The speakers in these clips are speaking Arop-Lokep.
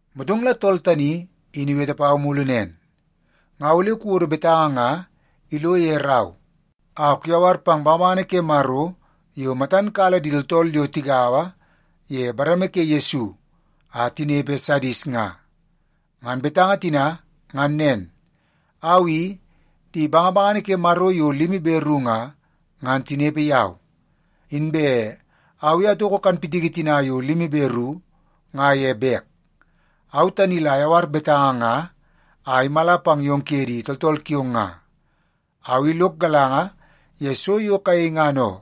Motong la tool tani in iwete pau mulu nen, “Nga ole kuwodo betanga nga ilo ye rau a kuyawar pang bangabangana ke Maro yo matan kala di tooltool yo tigaua ye bareme ke Yesu a tinepe Sadis nga. Ngan betanga tina ngan nen: Au i, di bangabangana ke Maro yo limi be ru nga, ngan tinepe yau. Inbe au i atoko kanpitiki tina yo limi be ru nga ye bek. Au tani la ayawar betanga nga a imala pang yong kuye di tooltool kiong nga. Au i lok galanga ye so yo kayei ngan oo.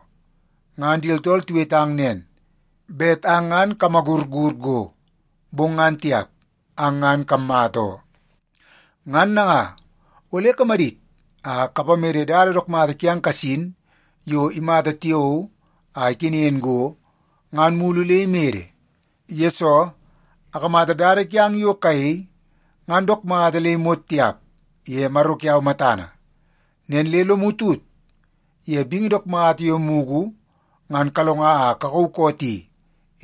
Ngan di tooltool tiwetang nen, bet ang ngan kamagurur go, bong ngan tiap. Ang ngan kammata oo. Ngan nanga, ole kamadit a kapamede dada dook mata kiang kasin yo imata tiao a ikenen go, ngan mulu le imede. Yesoo, akamata dada kiang yo kayei ngan dook mata le imot tiap ye Maro kiau matana. Nen le lomu tut ye bingi dook mata yo mugu ngan kalonga a kakauu koot i,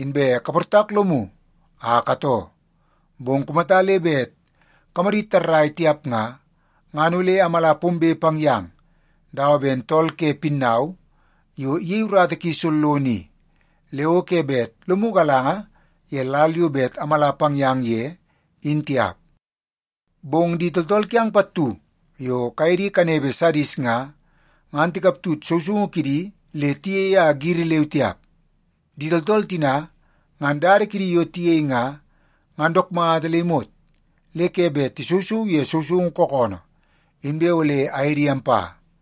inbe kaportak lomu a katoo. Bong kumata le bet kamadit tarrai tiap nga, ngan ole amala pombe pang yang dawa ben tool ke pinnau yo iyei urata ki sollono i, le o ke bet lomu galanga ye lal yo bet amala pang yang ye in tiap. Bong di tooltool kiang pattu yo kaye di kanepe Sadis nga, ngan tikaptut sousoungu kidi le tiyei a giri leu tiap. Di tooltool tina ngan dada kidi yo tiyei nga, ngan dook mata le imot le ke bet tisousou ye sousoungu kookoonoo, inbe ole aye di ampa.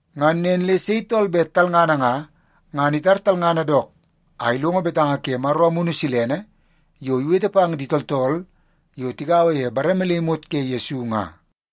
Ngan nen le sei tool bet talngana nga, ngan itar talngana dook a ilongo betanga ke Maro Amunu Silene yo iwete pang di tooltool yo tigaua ye bareme le imot ke Yesu nga.”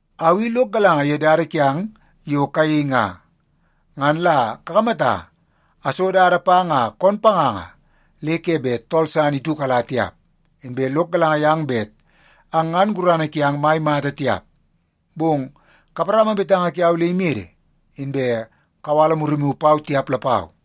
Au i lok galanga ye dada kiang yo kayei nga. Ngan la kakamata, aso dada pang a koon panganga le ke bet tool san itiukala tiap. Inbe lok galanga yang bet ang ngan gurana kiang mai mata tiap, bong kaparama betanga kiau le imede, inbe kawala murimu pau tiap lapau.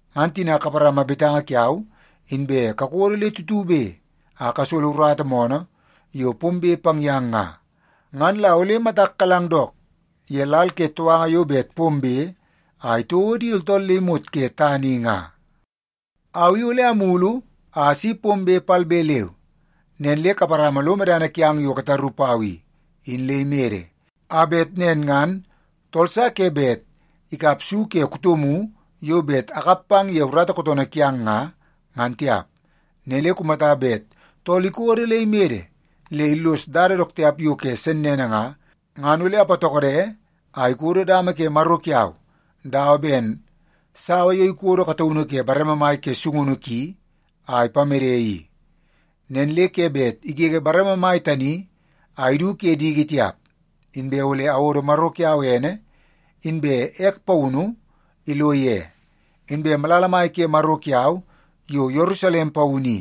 Ngan tina kaparama betanga kiau inbe kakodo le tutube a kasolo urata moonoo yo pombe pang yang nga, ngan la ole matak kalang dook ye lal ke touanga yo bet pombe a itouo di tooltool le imot ke tana i nga. Au i ole amulu a asi pombe palbe leu. Nen le kaparama lo medana kiang yo kataru pau i, in le imede, a bet nen ngan tool sa ke bet ikap su ke kutomu yo bet akap pang ye urata kootoonoo kiang nga, ngan tiap. Nen le kumata bet tool ikodo le imede le illos dada dook tiap yo ke sennene nga, ngan ole apatokode a ikodo dama ke Maro kiau dawa ben sawa yo ikodo kataunu ke bareme mai ke sungunu ki a ipamede i. Nen le ke bet igege bareme mai tani a idu ke diki tiap. Inbe ole awodo Maro kiau ene inbe ek paunu ilo ye. Inbe malala mai ke Maro kiau yo Yerusalem Paunu i,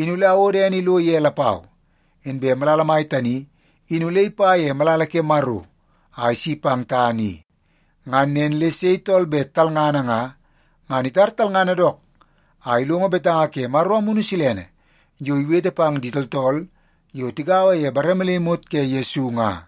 in ole awodo ene ilo ye lapau. Inbe malala mai tani in ole ipa ye malala ke Maro a isi pang tana i. Ngan nen le sei tool bet talngana nga, ngan itar talngana dook a ilongo betanga ke Maro Amunu Silene yo iwete pang di tooltool yo tigaua ye bareme le imot ke Yesu nga.”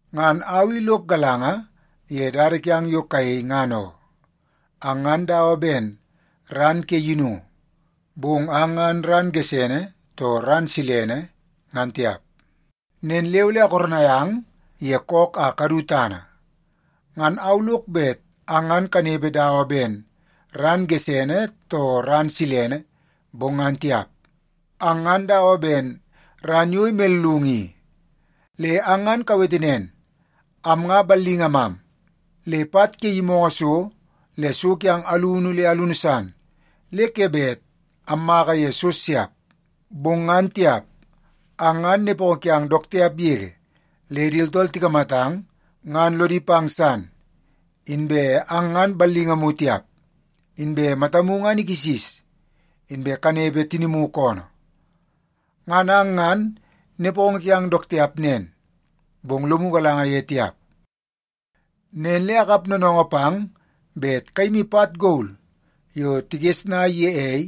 Ngan au i lok galanga ye dada kiang yo kayei ngan oo. Ang ngan dawa ben ran ke yinungu, bong ang ngan ran gesene too ran silene ngan tiap. Nen le ole akoronai ang ye kook a kadu tana. Ngan au lok bet ang ngan kanepe dawa ben ran gesene too ran silene, bong ngan tiap. Ang ngan dawa ben ran yo imellungu i. Le ang ngan kawete nen, ‘Am nga ballingamam, le pat ke yimoongoo so le so kiam alunu le alunu san le ke bet ammaka ye so siap.’ Bong ngan tiap, ang ngan nepongo kiang dook tiap yege le di tooltool tikamatang ngan lodi pang san. Inbe ang ngan ballingamu tiap, inbe matamu ngan ikisis, inbe kanepe tinimu koonoo. Ngan ang ngan nepongo kiang dook tiap nen, bong lomu galanga ye tiap. Nen le akap noonoongoo pang bet kayimi pat gol yo tigesnai ye ei,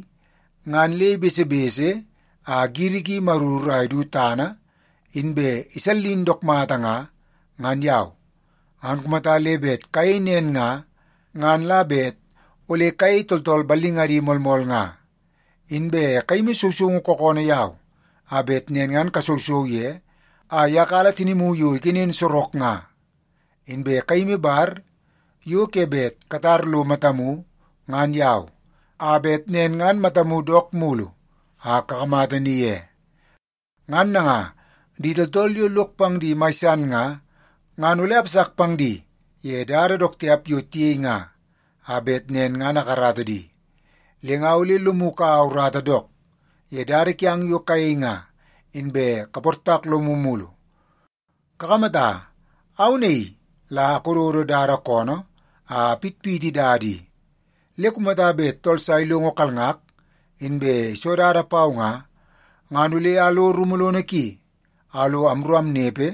ngan le ibesebese a giri ki imaruru a idu tana inbe isallin dook mata nga, ngan yau. Ngan kumata le bet kayei nen nga, ngan la bet ole kayei tooltool ballingadi moolmool nga. Inbe kayimi sousoungu kookoonoo yau a bet nen ngan kasousou ye a iyakala tinimu yo ikenen sorok nga. Inbe kayimi bar yo ke bet katar lo matamu ngan yau, a bet nen ngan matamu dook mulu a kakamata ni ye. Ngan nanga, di tooltool yo lok pang di mai san nga, ngan ole apasak pang di ye dada dook tiap yo tiyei nga, a bet nen ngan akarata di. Le nga ole lomu ikaua urata dook ye dada kiang yo kayei nga, inbe kaportak lomu mulu. Kakamata, au naii la akododo dada koonoo a apitpiti dada i, le kumata bet tool sa ilongo kalngak inbe iso dada pau nga, ngan ole alo rumu lono ki a lo amru amnepe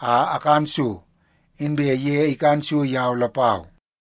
a akan so, inbe ye ikan so yau lapau.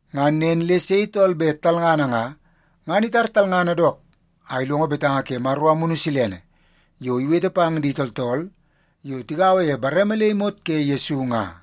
Ngan nen le sei tool bet talngana nga, ngan itara talngana dook a ilongo betanga ke Maro Amunu Silene yo iwete pang di tooltool yo tigaua ye bareme le imot ke Yesu nga.”